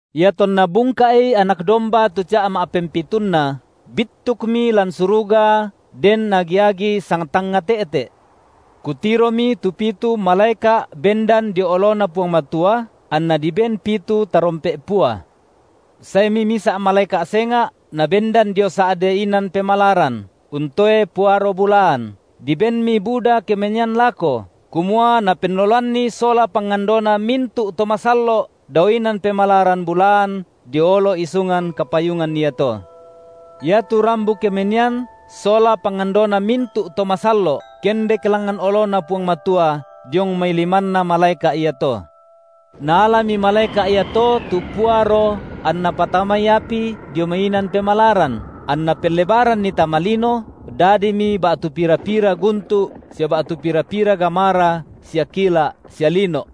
Iatonna bungka’i Anak domba tu ca’ ma’pempitunna, bittukmi lan suruga den agi-agi sangtangnga te’te’. Kutiromi tu pitu malaeka’ bendan dio oloNa Puang Matua, anna diben pitu tarompe’ pua. Saemi misa’ malaeka’ senga’ nabendan dio sa’de inan pemalaran, untoe puaro bulaan, dibenmi buda kemenian lako, kumua napennoloanni sola pangandona mintu’ to masallo’ dao inan pemalaran bulaan dio olo isungan kapayungan iato. Iatu rambu kemenian sola pangandona mintu’ to masallo’ kendek langngan oloNa Puang Matua diong mai limanna malaeka’ iato. Naalami malaeka’ iato tu puaro anna patamai api dio mai inan pemalaran, anna pellebaranni tama lino, dadimi ba’tu pira-pira guntu’ sia ba’tu pira-pira gamara sia kila’ sia lino’.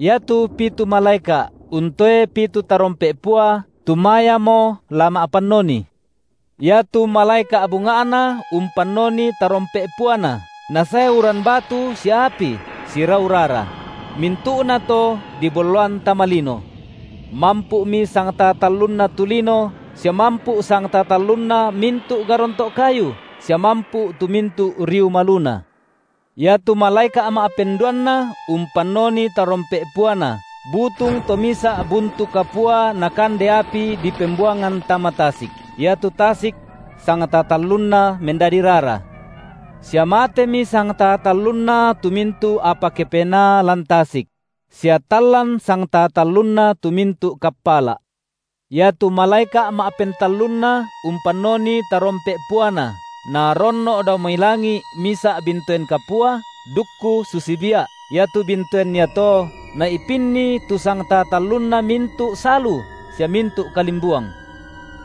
Iatu pitu malaeka’, untoe pitu tarompe’ pua tumayamo la ma’pannoni. Iatu malaeka’ bunga’na umpannoni tarompe’ puana, nasae uran batu sia api, sirau rara; mintu’nato dibolloan tama lino. Mampu’mi sangtaa tallunna tu lino sia mampu’ sangtaa tallunna mintu’ garonto’ kayu sia mampu’ tu mintu riu maluna. Iatu malaeka’ ma’penduanna umpannoni tarompe’ puana, butung to misa’ buntu kapua nakande api dipembuangan tama tasik; iatu tasik sangtaa tallunna mendadi rara; Sia matemi sangtaa tallunna tu mintu’ apa kepenaa lan tasik; sia tallan sangtaa tallunna tu mintu’ kappala’. Mintu’ uai memmapai’ Iatu malaeka’ ma’pentallunna umpannoni tarompe’ puana, naronno’ dao mai langi’ misa’ bintoen kapua, dukku susi bia’, iatu bintoen iato, nai’pinni tu sangtaa tallunna mintu’ salu sia mintu kalimbuang.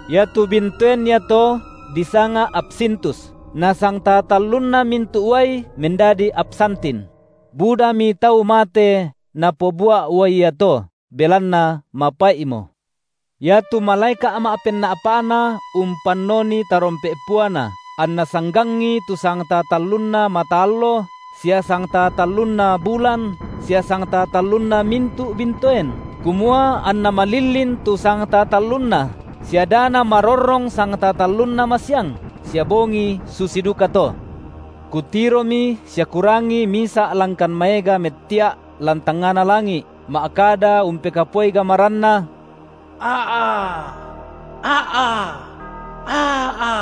Iatu bintoen iato disanga Apsintus, nasangtaa tallunna mintu’ uai mendadi apsantin; budami tau mate napobua’ uai iato, belanna mapai’mo. Iatu malaeka’ ma’penna’pa’na umpannoni tarompe’ puana, anna sanggangi tu sangtaa tallunna mata allo sia sangtaa tallunna bulan sia sangtaa tallunna mintu’ bintoen, kumua anna malillin tu sangtaa tallunna sia da namarorrong sangtaa tallunna masiang, sia bongi susi dukato. Kutiromi sia kurangi misa’ langkan maega mettia’ lan tangngana langi’ ma’kada umpekapuai gamaranna; A’a, a’a, a’a,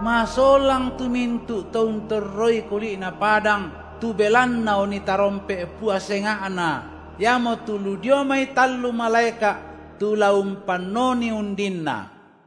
masolang tu mintu’ to untorroi kuli’na padang tu belanna oni tarompe’ pua senga’na, iamotu lu dio mai tallu malaeka’ tu la umpannonii undinna.